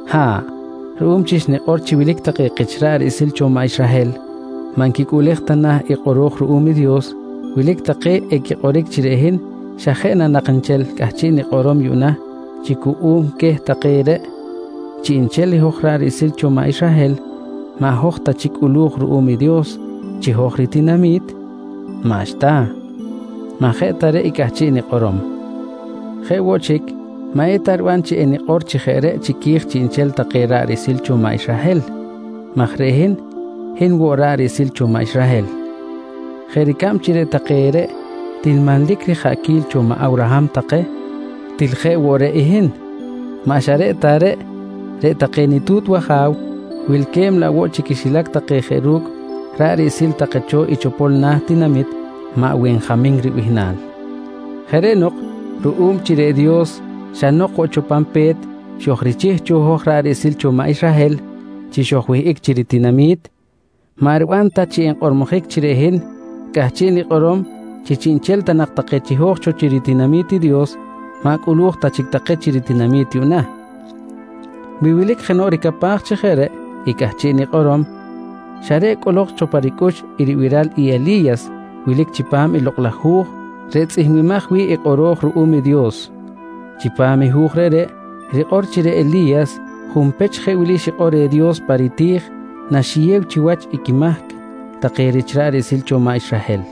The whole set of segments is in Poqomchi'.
Ha̱ꞌ, ruꞌum chi xnikꞌor chi wilic take kich ra̱ꞌ riꞌsil cho maꞌ Israhel maꞌ nquicꞌuꞌlej ta na i kꞌoro̱j ruꞌum i Dios, wilic take equikꞌoric chi reꞌ hin xa jeꞌ na nak nchel cꞌahchiꞌ nikꞌorom yuꞌna chi cuꞌum queh take reꞌ, chiꞌnchel i hoj ra̱ꞌ riꞌsil cho maꞌ Israhel maꞌ hoj ta chic cꞌulu̱j ruꞌum i Dios chi hoj ritinami̱t? Maꞌxta! Maꞌ jeꞌ ta reꞌ i cꞌahchiꞌ nikꞌorom. Jeꞌ woꞌ chic, maꞌ eta riban chi enikꞌor chi jeꞌ reꞌ chiqui̱j chiꞌnchel take ra̱ꞌ riꞌsil cho maꞌ Israhel maj reꞌ hin, hin woꞌ ra̱ꞌ riꞌsil cho maꞌ Israhel. Jeꞌ ricab chi reꞌ take reꞌ til manlic rijaꞌquil cho maꞌ Awraham take, til hin jeꞌ woꞌ reꞌ i hin. Maꞌ xa reꞌ ta reꞌ, reꞌ take nitu̱t waja̱w wilque̱b laꞌ woꞌ chi quixilac take jeꞌ ru̱cꞌ ra̱ꞌ riꞌsil take cho i chopol na̱ tinamit maꞌ Wenjamin ribihnal. Jeꞌ reꞌ nok ruꞌum chi reꞌ Dios xa nok woꞌ cho pan pe̱t xojrichih cho hoj ra̱ꞌ riꞌsil cho maꞌ Israhel chi xojwihꞌic chi ritinami̱t, maꞌ riban ta chi nkꞌormojic chi reꞌ hin cꞌahchiꞌ nikꞌorom chi chiꞌnchel ta nak take chiho̱j cho chi ritinami̱t i Dios maꞌ cꞌulu̱j ta chic take chi ritinami̱t yuꞌna. Wi wilic jenoꞌ ricapaj chi jeꞌ reꞌ i cꞌahchiꞌ nikꞌorom, xa reꞌ cꞌolok cho pa ricꞌux i ribiral i Eli̱yas wilic chipam i Lokꞌ laj Hu̱j reꞌ tzꞌihmbimaj wi̱ꞌ i kꞌoro̱j ruꞌum i Dios. Chipam i Hu̱j reꞌreꞌ rikꞌor chi reꞌ Eli̱yas junpech jeꞌ wili xikꞌor reh Dios pa riti̱j naxiyew chiwach quimahc take rich ra̱ꞌ riꞌsil cho i maꞌ Israhel: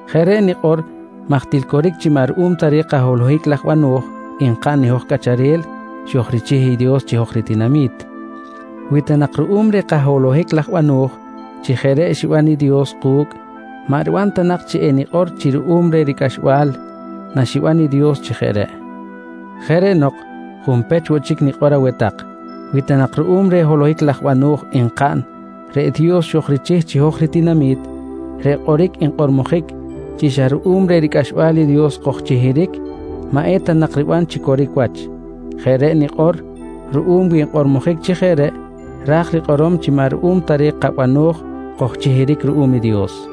Jeꞌ reꞌ nikꞌor maj til coric chi maꞌ ruꞌum ta reh kaholohic laj bano̱j nkaꞌn i hoj cꞌacharel xojrichih i Dios chi hoj ritinami̱t. Wi ta nak ruꞌum reh kaholohic laj bano̱j chi jeꞌ reꞌ xiban i Dios ku̱cꞌ, maꞌ riban ta nak chi enikꞌor chi ruꞌum reh ricꞌaxbal naxiban i Dios chi jeꞌ reꞌ. Jeꞌ reꞌ nok junpech woꞌ chic enikꞌor aweh tak, wi ta nak ruꞌum reh holohic laj bano̱j nkaꞌn reꞌ Dios xojrichih chi hoj ritinami̱t, reꞌ kꞌoric nkꞌormojic chi xa ruꞌum reh ricꞌaxbal i Dios kojchihiric, maꞌ eta nak riban chi coric wach. Jeꞌ reꞌ nikꞌor ruꞌum wi nkꞌormojic chi jeꞌ reꞌ, ra̱j rikꞌorom chi maꞌ ruꞌum ta reh kabano̱j kojchihiric ruꞌum i Dios.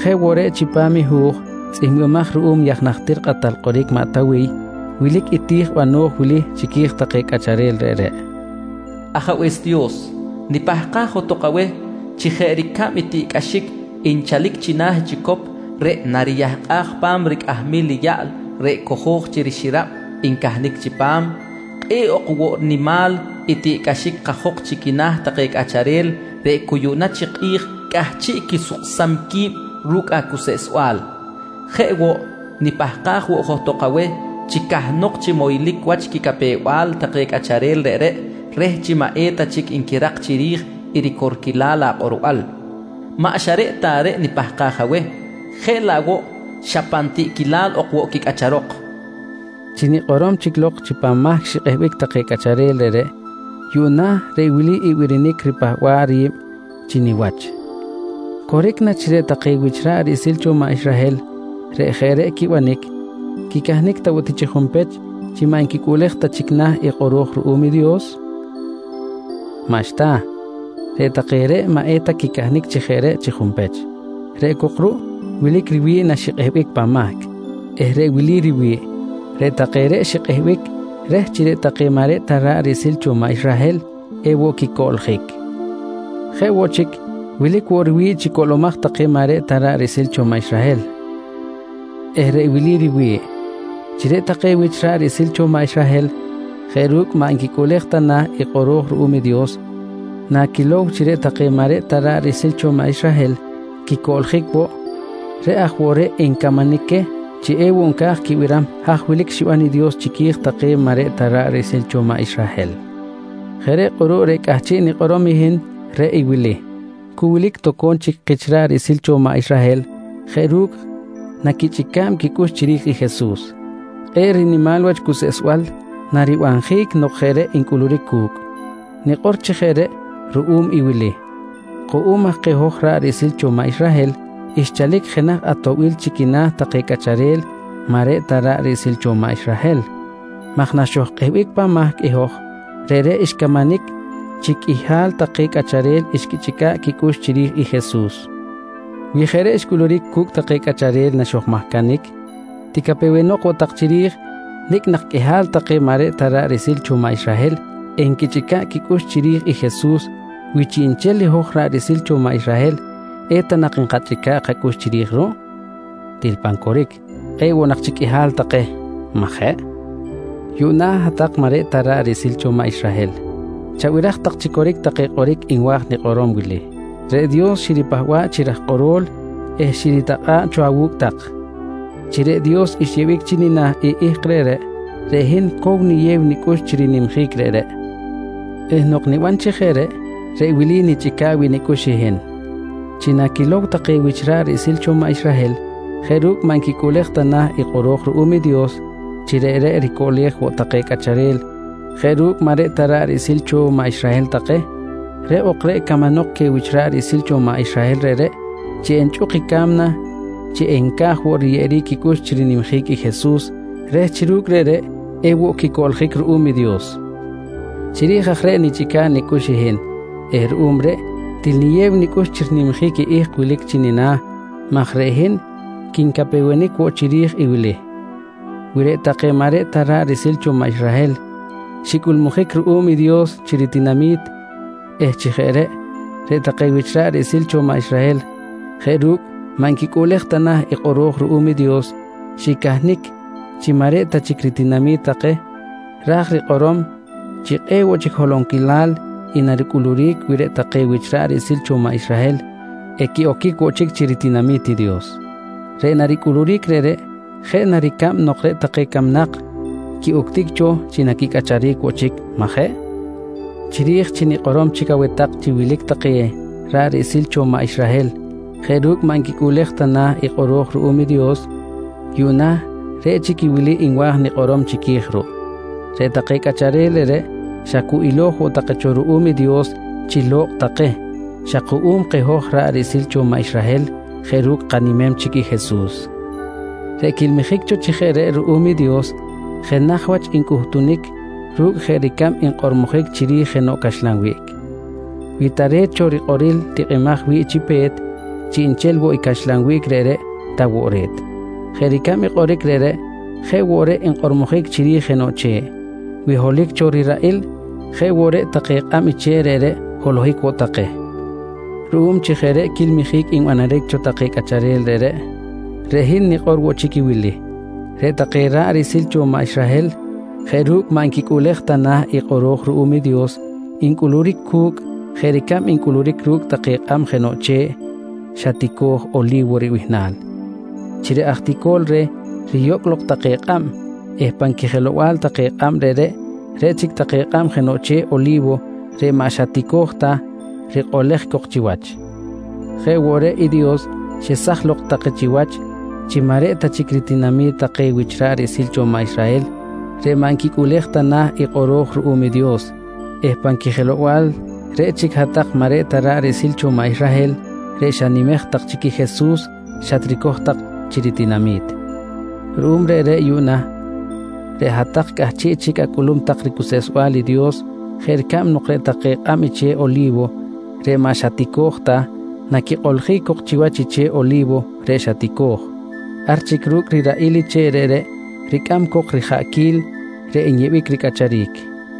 Jeꞌ woꞌ reꞌ, chipam i hu̱j tzꞌihmbimaj ruꞌum i aj najtir kꞌatal kꞌoric maꞌ Tawiy wilic i ti̱j bano̱j wili chiqui̱j take cꞌacharel reꞌreꞌ: “Ajabe̱s Dios, nipahkaj johtok aweh chi jeꞌ ricab i tiꞌcꞌaxic nchalic china̱ i chicop reꞌ nariyahkꞌaj pa̱m ricꞌahamil i yaꞌl reꞌ cojo̱j chi rixirab ncahnic chipam, kꞌe̱ꞌ ok woꞌ nimal i tiꞌcꞌaxic kajok chi quina̱ take cꞌacharel reꞌ cu yuꞌna chi kꞌi̱j cꞌahchiꞌ quisuksam qui̱b ru̱cꞌ acuseꞌsbal. Jeꞌ woꞌ, nipahkaj woꞌ johtok aweh chi cahnok chi moylic wach quicapew-bal take cꞌacharel reꞌreꞌ reh chi maꞌ eta chic nquirak chiri̱j i ricorquilal akꞌorbal. Maꞌ xa reꞌ ta reꞌ nipahkaj aweh, jeꞌ laꞌ woꞌ xa pan tiꞌquilal ok woꞌ quicꞌacharok, nqui maꞌ Tawiy. Chi nikꞌorom chic lok chi pan mahc xikꞌehbic take cꞌacharel reꞌreꞌ, yuꞌna reꞌ wili i birinic ripahba̱ꞌ ri̱b chi niwach: Coric na chi reꞌ take wich ra̱ꞌ riꞌsil cho maꞌ Israhel reꞌ jeꞌ reꞌ quibanic, quicahnic ta woꞌ ti chi junpech chi maꞌ nquicꞌuꞌlej ta chic na̱ i kꞌoro̱j ruꞌum i Dios? Maꞌxta, reꞌ take reꞌ maꞌ eta quicahnic chi jeꞌ reꞌ chi junpech. Reꞌ cok ruꞌ wilic riwi̱ꞌ naxikꞌehbic pan mahc eh reꞌ wili riwi̱ꞌ: Reꞌ take reꞌ xikꞌehbic reh chi reꞌ take maꞌ reꞌ ta ra̱ꞌ riꞌsil cho maꞌ Israhel ewoꞌ quicoꞌljic. Jeꞌ woꞌ chic, wilic woꞌ riwi̱ꞌ chi coꞌlomaj take maꞌ reꞌ ta ra̱ꞌ riꞌsil cho maꞌ Israhel eh reꞌ wili riwi̱ꞌ: Chi reꞌ take wich ra̱ꞌ riꞌsil cho maꞌ Israhel jeꞌ ru̱cꞌ maꞌ nquicꞌuꞌlej ta na̱ i kꞌoro̱j ruꞌum i Dios, naquilow chi reꞌ take maꞌ reꞌ ta ra̱ꞌ riꞌsil cho maꞌ Israhel quicoꞌljic woꞌ, reꞌ aj woꞌ reꞌ encamanic queh chi ewoꞌ nca̱j quibiram haj wilic xiban i Dios chiqui̱j take maꞌ reꞌ ta take ra̱ꞌ riꞌsil cho maꞌ Israhel. Jeꞌ reꞌ kꞌuruꞌ reꞌ cꞌahchiꞌ nikꞌorom i hin reꞌ i wili: Cu wilic toco̱m chic kich ra̱ꞌ riꞌsil cho maꞌ Israhel jeꞌ ru̱cꞌ naquichꞌica̱b quicꞌux chiri̱j i Jesus. Kꞌe̱ꞌ rinimal wach cuseꞌsbal naribanjic nok jeꞌ reꞌ encꞌuluric cu̱cꞌ! Nikꞌor chi jeꞌ reꞌ ruꞌum i wili: Kuꞌum aj keh hoj ra̱ꞌ riꞌsil cho maꞌ Israhel xchalic jenaj atoꞌbil chi quina̱ take cꞌacharel maꞌ reꞌ ta ra̱ꞌ riꞌsil cho maꞌ Israhel maj naxojkꞌehbic pan mahc i hoj, reꞌreꞌ xcamanic chi qꞌuihal take cꞌacharel xquichꞌica̱ꞌ quicꞌux chiri̱j i Jesus. Wi jeꞌ reꞌ xcꞌuluric cu̱cꞌ take cꞌacharel naxojmahcanic, ticapewenok woꞌ tak chiri̱j nicꞌ nak qꞌuihal take maꞌ reꞌ ta ra̱ꞌ riꞌsil cho maꞌ Israhel enquichꞌica̱ꞌ quicꞌux chiri̱j i Jesus, wi chiꞌnchel i hoj ra̱ꞌ riꞌsil cho maꞌ Israhel eta nak nkachꞌica̱ꞌ kacꞌux chiri̱j ruꞌ? Til pan coric, kꞌe̱ꞌ woꞌ nak chic qꞌuihal take, majeꞌ? Yuꞌna hat-tak maꞌ reꞌ ta ra̱ꞌ riꞌsil cho maꞌ Israhel chabiraj tak chi coric take kꞌoric nwa̱j nikꞌorom wili: Reꞌ Dios xiripahba̱ꞌ chi raj kꞌoro̱l eh xiritakꞌa̱ꞌ cho awu̱cꞌ tak. Chi reꞌ Dios xyeꞌbic chi nina̱ i ihk reꞌreꞌ, reꞌ hin cow niyew nicꞌux chi rinimjic reꞌreꞌ eh nok niban chi jeꞌ reꞌ, reꞌ wili nichꞌica̱ꞌ wi̱ꞌ nicꞌux i hin: Chi naquilow take wich ra̱ꞌ riꞌsil cho maꞌ Israhel jeꞌ ru̱cꞌ maꞌ nquicꞌuꞌlej ta na̱ i kꞌoro̱j ruꞌum i Dios chi reꞌreꞌ ricoꞌlej woꞌ take cꞌacharel jeꞌ ru̱cꞌ maꞌ reꞌ ta ra̱ꞌ riꞌsil cho maꞌ Israhel take, reꞌ ok reꞌ camanok queh wich ra̱ꞌ riꞌsil cho maꞌ Israhel reꞌreꞌ chi enchꞌuk i ca̱mna chi enca̱j woꞌ riyeꞌeric quicꞌux chi rinimjic i Jesus reh chi ru̱cꞌ chi jeꞌ reꞌ ewoꞌ quicoꞌljic ruꞌum i Dios. Chiri̱j aj reꞌ nichꞌica̱ꞌ nicꞌux i hin eh ruꞌum reꞌ til niyew nicꞌux chi rinimjic ihk wilic chi nina̱ maj reꞌ hin quincapewenic woꞌ chiri̱j i wili: Wi reꞌ take maꞌ reꞌ ta ra̱ꞌ riꞌsil cho maꞌ Israhel xcꞌulmujic ruꞌum i Dios chi ritinami̱t eh chi jeꞌ reꞌ, reꞌ take wich ra̱ꞌ riꞌsil cho maꞌ Israhel jeꞌ ru̱cꞌ maꞌ nquicꞌuꞌlej ta na̱ i kꞌoro̱j ruꞌum i Dios xicahnic chi maꞌ reꞌ ta chic ritinami̱t take, ra̱j rikꞌorom chi kꞌe̱ꞌ woꞌ chic holonquilal i naricꞌuluric wi reꞌ take wich ra̱ꞌ riꞌsil cho maꞌ Israhel equiꞌoquic woꞌ chic chi ritinami̱t i Dios. Reꞌ naricꞌuluric reꞌreꞌ jeꞌ na ricab nok reꞌ take camnak quiꞌuctic cho chi naquicꞌacharic woꞌ chic, majeꞌ? Chiri̱j chi nikꞌorom chic aweh tak chi wilic take ra̱ꞌ riꞌsil cho maꞌ Israhel jeꞌ ru̱cꞌ maꞌ nquicꞌuꞌlej ta na̱ i kꞌoro̱j ruꞌum i Dios, yuꞌna reꞌ chic i wili nwa̱j woꞌ nikꞌorom chiqui̱j ruꞌ: Reꞌ take cꞌacharel reꞌreꞌ xa cu ilo̱j woꞌ take cho ruꞌum i Dios chi lo̱kꞌ take xa kuꞌum keh hoj ra̱ꞌ riꞌsil cho maꞌ Israhel jeꞌ ru̱cꞌ kanimem chic i Jesus. Reꞌ quilmijic cho chi jeꞌ reꞌ ruꞌum i Dios jenaj wach ncꞌutunic ru̱cꞌ jeꞌ ricab nkꞌormojic chiri̱j jenoꞌ caxlan wiꞌc: Wi tare̱t cho rikꞌoril tikꞌimaj wi̱ꞌ chi pe̱t, chiꞌnchel woꞌ i caxlan wiꞌc reꞌreꞌ ta woꞌ re̱t. Jeꞌ ricab i kꞌoric reꞌreꞌ, jeꞌ woꞌ reꞌ nkꞌormojic chiri̱j jenoꞌ che̱ꞌ: Wi holohic cho riraꞌil, jeꞌ woꞌ reꞌ take kꞌab i che̱ꞌ reꞌreꞌ holohic woꞌ take. Ruꞌum chi jeꞌ reꞌ quilmijic nbanaric cho take cꞌacharel reꞌreꞌ, reꞌ hin nikꞌor woꞌ chic i wili: Reꞌ take ra̱ꞌ riꞌsil cho maꞌ Israhel jeꞌ ru̱cꞌ maꞌ nquicꞌuꞌlej ta na̱ i kꞌoro̱j ruꞌum i Dios ncꞌuluric cu̱cꞌ jeꞌ ricab ncꞌuluric ru̱cꞌ take kꞌab jenoꞌ che̱ꞌ xa tico̱j Oli̱wo ribihnal chi reꞌ aj ticol reh riyocꞌ lok take kꞌab eh pan quijelow-bal take kꞌab reꞌreꞌ, reꞌ chic take kꞌab jenoꞌ che̱ꞌ Oli̱wo reꞌ xa maꞌ tico̱j ta, rikꞌolej cok chiwach. Jeꞌ woꞌ reꞌ i Dios xesaj lok take chiwach chi maꞌ reꞌ ta chic ritinami̱t take wich ra̱ꞌ riꞌsil cho maꞌ Israhel reꞌ maꞌ nquicꞌuꞌlej ta na̱ i kꞌoro̱j ruꞌum i Dios eh pan quijelow-bal reꞌ chic hat-tak maꞌ reꞌ ta ra̱ꞌ riꞌsil cho maꞌ Israhel reꞌ xanimej tak chic i Jesus xatricoj tak chi ritinami̱t. Ruꞌum reꞌreꞌ yuꞌna, reꞌ hat-tak cꞌahchiꞌ chic acꞌulum tak ricuseꞌsbal i Dios jeꞌ ricab nok reꞌ take kꞌab i che̱ꞌ Oli̱wo reꞌ maꞌ xa tico̱j ta, naquikꞌoljic cok chiwach i che̱ꞌ Oli̱wo reꞌ xa tico̱j, ar chic ru̱cꞌ riraꞌil i che̱ꞌ reꞌreꞌ ricꞌam cok rijaꞌquil reꞌ nyeꞌbic ricꞌacharic.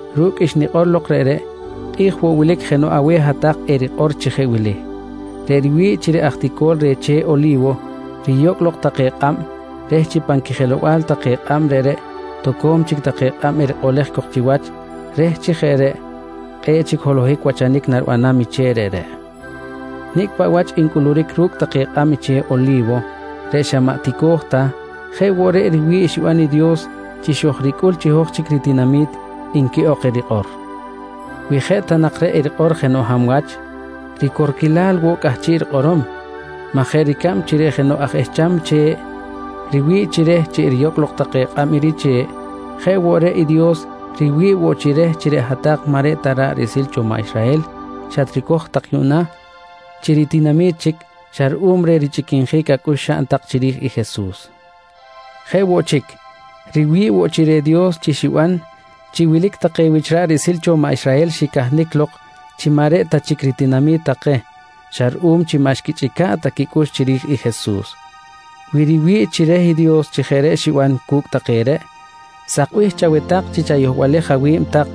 Ru̱cꞌ xnikꞌor lok reꞌreꞌ kꞌi̱j woꞌ wilic jenoꞌ aweh hat-tak erikꞌor chi jeꞌ wili: «Reꞌ riwi̱ꞌ chi reꞌ aj tico̱l reh che̱ꞌ Oli̱wo riyocꞌ lok take kꞌab reh chi pan quijelow-bal take kꞌab reꞌreꞌ toco̱m chic take kꞌab erikꞌolej cok chiwach reh chi jeꞌ reꞌ kꞌe̱ꞌ chic holohic wachanic naribanam i che̱ꞌ reꞌreꞌ. Nicꞌ paꞌ wach ncꞌuluric ru̱cꞌ take kꞌab i che̱ꞌ Oli̱wo reꞌ xa maꞌ tico̱j ta, jeꞌ woꞌ reꞌ riwi̱ꞌ xiban i Dios chi xojricꞌul chi hoj chic ritinami̱t, nqui ok erikꞌor. Wi jeꞌ ta nak reꞌ erikꞌor jenoꞌ hab wach, ricorquilal woꞌ cꞌahchiꞌ rikꞌorom maj jeꞌ ricab chi reꞌ jenoꞌ aj ehcham che̱ꞌ riwi̱ꞌ chi reh chi eriyocꞌ lok take kꞌab i riche̱ꞌ, jeꞌ woꞌ reꞌ i Dios riwi̱ꞌ woꞌ chi reh chi reꞌ hat-tak maꞌ reꞌ ta ra̱ꞌ riꞌsil cho maꞌ Israhel xatricoj tak yuꞌna chi ritinami̱t chic xa ruꞌum reh richꞌiquinjic acꞌux xaꞌn tak chiri̱j i Jesus. Jeꞌ woꞌ chic, riwi̱ꞌ woꞌ chi reh Dios chi xiban chi wilic take wich ra̱ꞌ riꞌsil cho maꞌ Israhel xicahnic lok chi maꞌ reꞌ ta chic ritinami̱t take xa ruꞌum chi maꞌ xquichꞌica̱ꞌ ta quicꞌux chiri̱j i Jesus. Wi riwi̱ꞌ chi reh i Dios chi jeꞌ reꞌ xiban cu̱cꞌ take reꞌ, sakbih chaweh tak chi chayohbalej awi̱b tak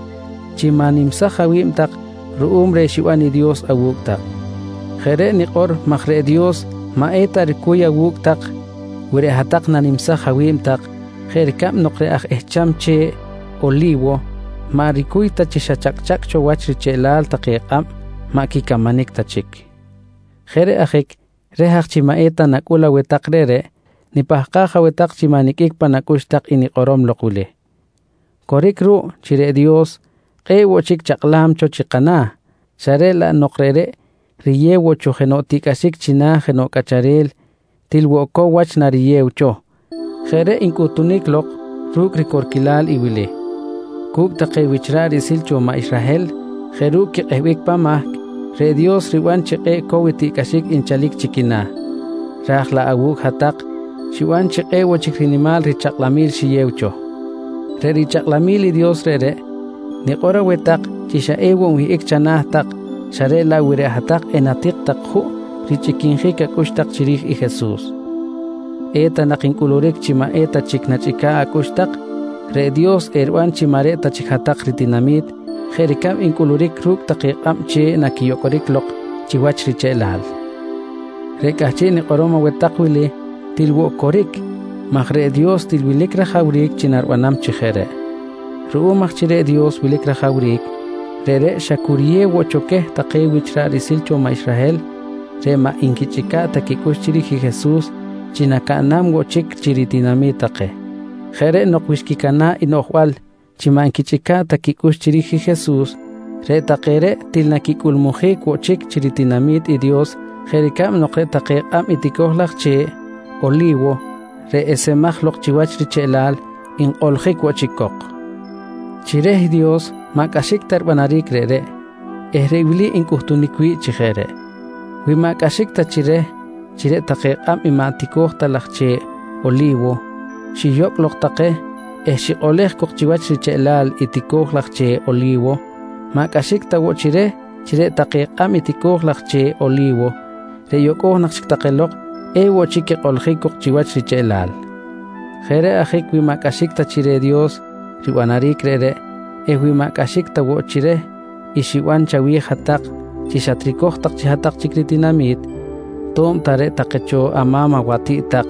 chi ma̱nimsaj awi̱b tak ruꞌum reh xiban i Dios awu̱cꞌ tak. Jeꞌ reꞌ nikꞌor maj reꞌ Dios maꞌ eta ricuy awu̱cꞌ tak wi reꞌ hat-tak nanimsaj awi̱b tak, jeꞌ ricab nok reꞌ aj ehcham che̱ꞌ Oli̱wo maꞌ ricuy ta chi xa chacꞌa̱cꞌ cho wach richeꞌlal take kꞌab maꞌ quicamanic ta chic. Jeꞌ reꞌ ajic reh aj chi maꞌ eta nacꞌul aweh tak reꞌreꞌ, nipahkaj aweh tak chi maꞌ niqꞌuic pan acꞌux tak i nikꞌorom lok wili: Coric ruꞌ chi reꞌ Dios kꞌe̱ꞌ woꞌ chic chakꞌlam cho chi kana̱ xa reꞌ laꞌ nok reꞌreꞌ riyew woꞌ cho jenoꞌ tiꞌcꞌaxic china̱ jenoꞌ cꞌacharel til woꞌ cow wach nariyew cho. Jeꞌ reꞌ ncꞌuhtunic lok ru̱cꞌ ricorquilal wili: Cu̱cꞌ take wich ra̱ꞌ riꞌsil cho maꞌ Israhel jeꞌ ru̱cꞌ quikꞌehbic pan mahc, reꞌ Dios ribanam chi kꞌe̱ꞌ cow i tiꞌcꞌaxic nchalic chi quina̱, raj laꞌ awu̱cꞌ hat-tak xiban chi kꞌe̱ꞌ woꞌ chic rinimal richakꞌlamil xiyew cho. Reꞌ richakꞌlamil i Dios reꞌreꞌ, nikꞌor aweh tak chi xa ewoꞌ nwihꞌic chana̱ tak xa reꞌ laꞌ wi reꞌ hat-tak enatik tak juꞌ richꞌiquinjic acꞌux tak chiri̱j i Jesus. Eta nak ncꞌuluric chi maꞌ eta chic nachꞌica̱ꞌ acꞌux tak, reꞌ Dios eriban chi maꞌ reꞌ ta chic hat-tak ritinami̱t, jeꞌ ricab ncꞌuluric ru̱cꞌ take kꞌab che̱ꞌ naquiyocꞌoric lok chiwach richeꞌlal. Reꞌ cꞌahchiꞌ nikꞌorom aweh tak wili til woꞌ coric maj reꞌ Dios til wilic rajawric chi naribanam chi jeꞌ reꞌ. Ruꞌum aj chi reꞌ Dios wilic rajawric, reꞌreꞌ xa cu riyew woꞌ cho queh take wich ra̱ꞌ riꞌsil cho maꞌ Israhel reꞌ maꞌ nquichꞌica̱ꞌ ta quicꞌux chiri̱j i Jesus chi nacaꞌnam woꞌ chic chi ritinami̱t take. Jeꞌ reꞌ nok wi xquicana̱ꞌ i quinoꞌjbal chi maꞌ nquichꞌica̱ꞌ ta quicꞌux chiri̱j i Jesus, reꞌ take reꞌ til naquicꞌulmujic woꞌ chic chi ritinami̱t i Dios jeꞌ ricab nok reꞌ take kꞌab i tico̱j laj che̱ꞌ Oli̱wo reꞌ esemaj lok chiwach richeꞌlal nkꞌoljic woꞌ chic cok. Chi reh Dios maꞌ cꞌaxic ta ribanaric reꞌreꞌ eh reꞌ wili ncꞌutunic wi̱ꞌ chi jeꞌ reꞌ: Wi maꞌ cꞌaxic ta chi reh chi reꞌ take kꞌab i maꞌ tico̱j ta laj che̱ꞌ Oli̱wo xiyocꞌ take lok eh xikꞌolej cok chiwach richeꞌlal i tico̱j laj che̱ꞌ Oli̱wo, maꞌ cꞌaxic ta woꞌ chi reh chi reꞌ take kꞌab i tico̱j laj che̱ꞌ Oli̱wo reꞌ yocꞌo̱j nak chic take lok ewoꞌ chic quikꞌoljic cok chiwach richeꞌlal. Jeꞌ reꞌ ajic wi maꞌ cꞌaxic ta chi reh Dios ribanaric reꞌreꞌ eh wi maꞌ cꞌaxic ta woꞌ chi reh i xiban chawi̱j hat-tak chi xatricoj tak chi hat-tak chic ritinami̱t, to̱b ta reꞌ take cho ama̱m awatiꞌt tak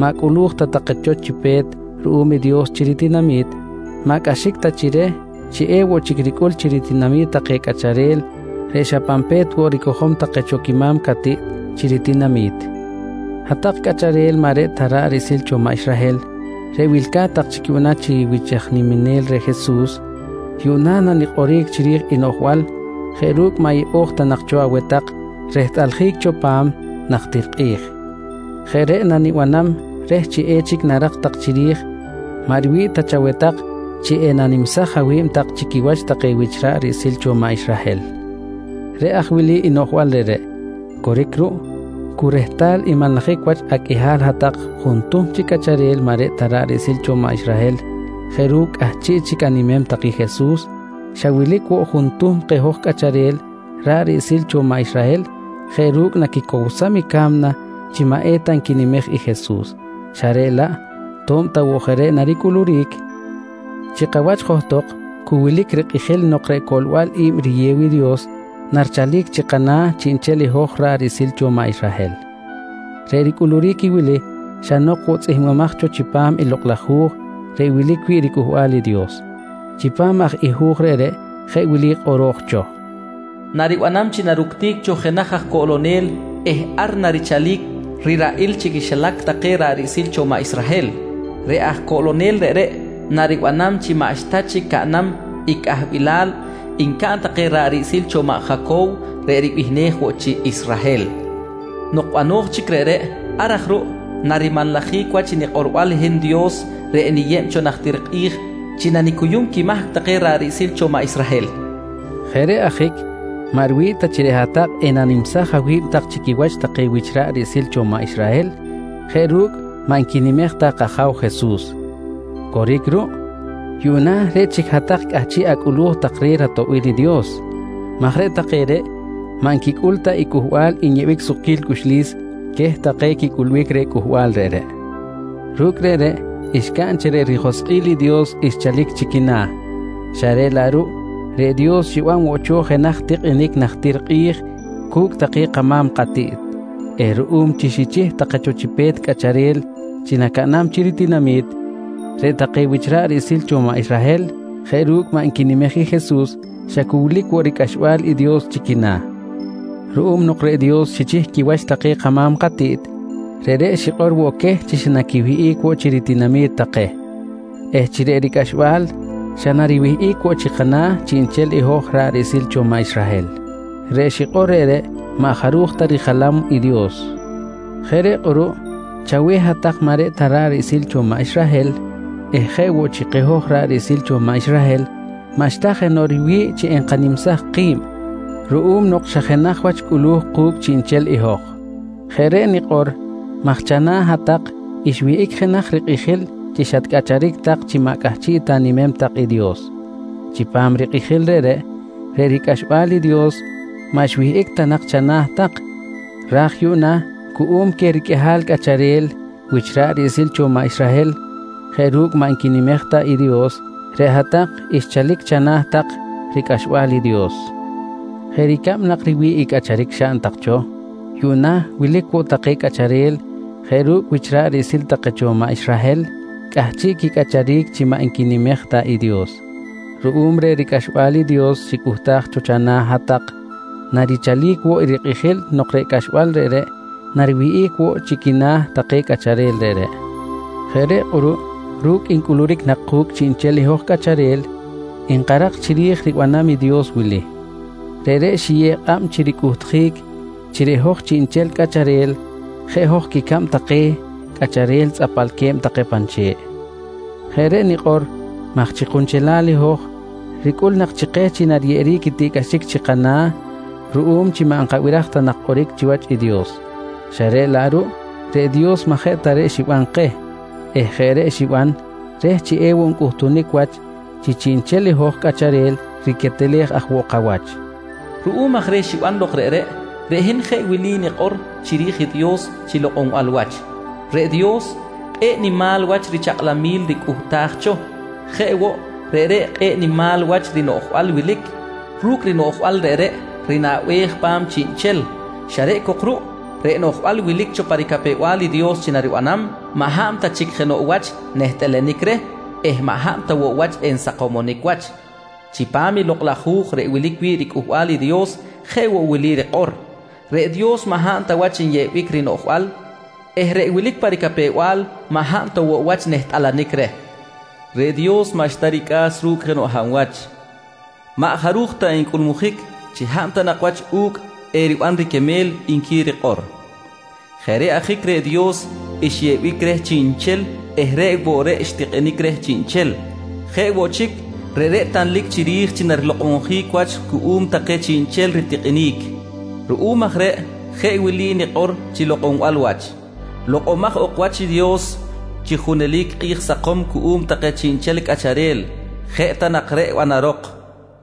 maꞌ cꞌulu̱j ta take cho chi pe̱t ruꞌum i Dios chi ritinami̱t, maꞌ cꞌaxic ta chi reh chi ewoꞌ chic ricꞌul chi ritinami̱t take cꞌacharel reꞌ xa pan pe̱t woꞌ ricojom take cho quima̱m catiꞌt chi ritinami̱t. Hat-tak cꞌacharel maꞌ reꞌ ta ra̱ꞌ riꞌsil cho maꞌ Israhel reꞌ wilca̱t tak chic yuꞌna chi wich aj niminel reh Jesus, yuꞌna nanikꞌoric chiri̱j i noꞌjbal jeꞌ ru̱cꞌ maꞌ yeꞌo̱j ta nak cho aweh tak rehtꞌaljic cho pa̱m najtir kꞌi̱j. Jeꞌ reꞌ nanibanam reh chi echic narak tak chiri̱j maꞌ riwi̱ꞌ ta chaweh tak chi enanimsaj awi̱b tak chi quiwach take wich ra̱ꞌ riꞌsil cho maꞌ Israhel. Reꞌ aj wili i noꞌjbal reꞌreꞌ: Coric ruꞌ, cu rehtal nmanlajic wach aqꞌuihal hat-tak juntuhm chi cꞌacharel maꞌ reꞌ ta ra̱ꞌ riꞌsil cho maꞌ Israhel jeꞌ ru̱cꞌ cꞌahchiꞌ chic animem tak i Jesus, xa wilic woꞌ juntuhm keh hoj cꞌacharel ra̱ꞌ riꞌsil cho maꞌ Israhel jeꞌ ru̱cꞌ naquicowsam i ca̱mna chi maꞌ eta nquinimej i Jesus, xa reꞌ laꞌ to̱b ta woꞌ jeꞌ reꞌ naricꞌuluric, chi kawach johtok cu wilic rikꞌijil nok reꞌ coꞌlbal i̱b riyew i Dios narichalic chi kana̱ chiꞌnchel i hoj ra̱ꞌ riꞌsil cho maꞌ Israhel. Reꞌ ricꞌuluric i wili xa nok woꞌ tzꞌihmbimaj cho chipam i lok laj Hu̱j reꞌ wilic wi̱ꞌ riCꞌuhbal i Dios. Chipam aj i hu̱j reꞌreꞌ jeꞌ wili kꞌoro̱j cho: “Naribanam chi naructic cho jenaj aj coꞌlonel eh ar narichalic riraꞌil chi quixilac take ra̱ꞌ riꞌsil cho maꞌ Israhel. Reꞌ aj coꞌlonel reꞌreꞌ naribanam chi maꞌxta chic caꞌnam i cꞌahbilal ncaꞌn take ra̱ꞌ riꞌsil cho maꞌ Jacow reꞌ ribihnej woꞌ chi Israhel. Nok bano̱j chic reꞌreꞌ, ar aj ruꞌ narimanlajic wach i nikꞌorbal hin Dios reꞌ niyeb cho najtir kꞌi̱j chi nanicuyum quimahc take ra̱ꞌ riꞌsil cho maꞌ Israhel, nqui kꞌoro̱j cho. Jeꞌ reꞌ ajic maꞌ riwi̱ꞌ ta chi reꞌ hat-tak enanimsaj awi̱b tak chi quiwach take wich ra̱ꞌ riꞌsil cho maꞌ Israhel jeꞌ ru̱cꞌ maꞌ nquinimej ta kAja̱w Jesus. Coric ruꞌ, yuꞌna reꞌ chic hat-tak cꞌahchiꞌ acꞌulu̱j tak reh ratoꞌbil i Dios maj reꞌ take reꞌ maꞌ nquicꞌul ta i Cꞌuhbal nyeꞌbic sukquil cꞌuxlis queh take quicꞌulbic reh cꞌuhbal reꞌreꞌ. Ru̱cꞌ reꞌreꞌ xcaꞌn chi reꞌ rijoskꞌil i Dios xchalic chi quina̱, xa reꞌ laꞌ ruꞌ reꞌ Dios xiban woꞌ cho jenaj tikꞌinic najtir kꞌi̱j cu̱cꞌ take kama̱m katiꞌt eh ruꞌum chi xichih take cho chi pe̱t cꞌacharel chi nacaꞌnam chi ritinami̱t, reꞌ take wich ra̱ꞌ riꞌsil cho maꞌ Israhel jeꞌ ru̱cꞌ maꞌ nquinimej i Jesus xa cu wilic woꞌ ricꞌaxbal i Dios chi quina̱. Ruꞌum nok reꞌ Dios xichih quiwach take kama̱m katiꞌt, reꞌreꞌ xikꞌor woꞌ queh chi xa naquiwihꞌic woꞌ chi ritinami̱t take eh chi reꞌ ricꞌaxbal xa nariwihꞌic woꞌ chi kana̱ chiꞌnchel i hoj ra̱ꞌ riꞌsil cho maꞌ Israhel. Reꞌ xikꞌor reꞌreꞌ maꞌ jaruj ta rijalam i Dios. Jeꞌ reꞌ kꞌuruꞌ chaweh hat-tak maꞌ reꞌ ta raꞌril cho maꞌ Israhel eh jeꞌ woꞌ chi keh hoj ra̱ꞌ riꞌsil cho maꞌ Israhel maꞌxta jenoꞌ riwi̱ꞌ chi enkanimsaj ki̱b ruꞌum nok xa jenaj wach cꞌulu̱j ku̱cꞌ chiꞌnchel i hoj. Jeꞌ reꞌ nikꞌor maj chana̱ hat-tak xwihꞌic jenaj rikꞌijil chi xatcꞌacharic tak chi maꞌ cꞌahchiꞌ ta animem tak i Dios. Chipam rikꞌijil reꞌreꞌ, reꞌ ricꞌaxbal i Dios maꞌ xwihꞌic ta nak chana̱ tak ra̱j yuꞌna cuꞌum queh riqꞌuihal cꞌacharel wich ra̱ꞌ riꞌsil cho maꞌ Israhel jeꞌ ru̱cꞌ maꞌ nquinimej ta i Dios, reꞌ hat-tak xchalic chana̱ tak ricꞌaxbal i Dios. Jeꞌ ricab nak riwi̱ꞌ i cꞌacharic xaꞌn tak cho, yuꞌna wilic woꞌ take cꞌacharel jeꞌ ru̱cꞌ wich ra̱ꞌ riꞌsil take cho maꞌ Israhel cꞌahchiꞌ quicꞌacharic chi maꞌ nquinimej ta i Dios. Ruꞌum reh ricꞌaxbal i Dios xicꞌuhtaj cho chana̱ hat-tak, narichalic woꞌ i rikꞌijil nok reꞌ cꞌaxbal reꞌreꞌ nariwihꞌic woꞌ chi quina̱ take cꞌacharel reꞌreꞌ. Jeꞌ reꞌ kꞌuruꞌ ru̱cꞌ ncꞌuluric nak ku̱cꞌ chiꞌnchel i hoj cꞌacharel, nkarak chiri̱j i ribanam i Dios wili: Reꞌreꞌ xiyew kꞌab chi ricꞌuhtjic chi reꞌ hoj chiꞌnchel cꞌacharel jeꞌ hoj quicab take cꞌacharel tzꞌapalque̱b take pan che̱ꞌ. Jeꞌ reꞌ nikꞌor maj chi kunchelal i hoj ricꞌul nak chi keh chi nariyeꞌeric tiꞌcꞌaxic chi kana̱ ruꞌum chi maꞌ nkabiraj ta nak kꞌoric chiwach i Dios. Xa reꞌ laꞌ ruꞌ reꞌ Dios maꞌ jeꞌ ta reꞌ xiban keh eh jeꞌ reꞌ xiban reh chi ewoꞌ ncꞌuhtunic wach chi chiꞌnchel hoj cꞌacharel riquetelej aj woꞌ kawach. Ruꞌum aj reh xiban lok reꞌreꞌ, reꞌ hin jeꞌ wili nikꞌor chiri̱j i Dios chi lokꞌonbal wach: Reꞌ Dios, kꞌe̱ꞌ nimal wach richakꞌlamil ricꞌuhtaj cho. Jeꞌ woꞌ, reꞌreꞌ kꞌe̱ꞌ rinimal wach rinoꞌjbal wilic. Ru̱cꞌ rinoꞌjbal reꞌreꞌ rinaꞌbej pa̱m chiꞌnchel xa reꞌ cok ruꞌ reꞌ noꞌjbal wilic cho pa ricapew-bal i Dios chi naribanam maꞌ hab ta chic jenoꞌ wach nehtꞌalanic reh eh maꞌ hab ta woꞌ wach ensakomonic wach. Chipam i Lokꞌ laj Hu̱j reꞌ wilic wi̱ꞌ riCꞌuhbal i Dios jeꞌ woꞌ wili rikꞌor: “Reꞌ Dios maꞌ hab ta wach nyeꞌbic rinoꞌjbal eh reꞌ wilic pa ricapew-bal maꞌ hab ta woꞌ wach nehtꞌalanic reh. Reꞌ Dios maꞌxta ricꞌa̱s ru̱cꞌ jenoꞌ hab wach. Maꞌ jaruj ta encꞌulmujic chi hab ta nak wach u̱cꞌ eriban riquemel, nqui rikꞌor. Jeꞌ reꞌ ajic reꞌ Dios nyeꞌbic reh chiꞌnchel eh reꞌ woꞌ reꞌ xtikꞌinic reh chiꞌnchel. Jeꞌ woꞌ chic, reꞌreꞌ tanlic chiri̱j chi narilokꞌonjic wach cuꞌum take chiꞌnchel ritikꞌinic. Ruꞌum aj reꞌ jeꞌ wili nikꞌor chi lokꞌonbal wach: Lokꞌomaj ok wach i Dios chi junelic kꞌi̱j sakom cuꞌum take chiꞌnchel cꞌacharel. Jeꞌ ta nak reꞌ banarok, nqui nikꞌor.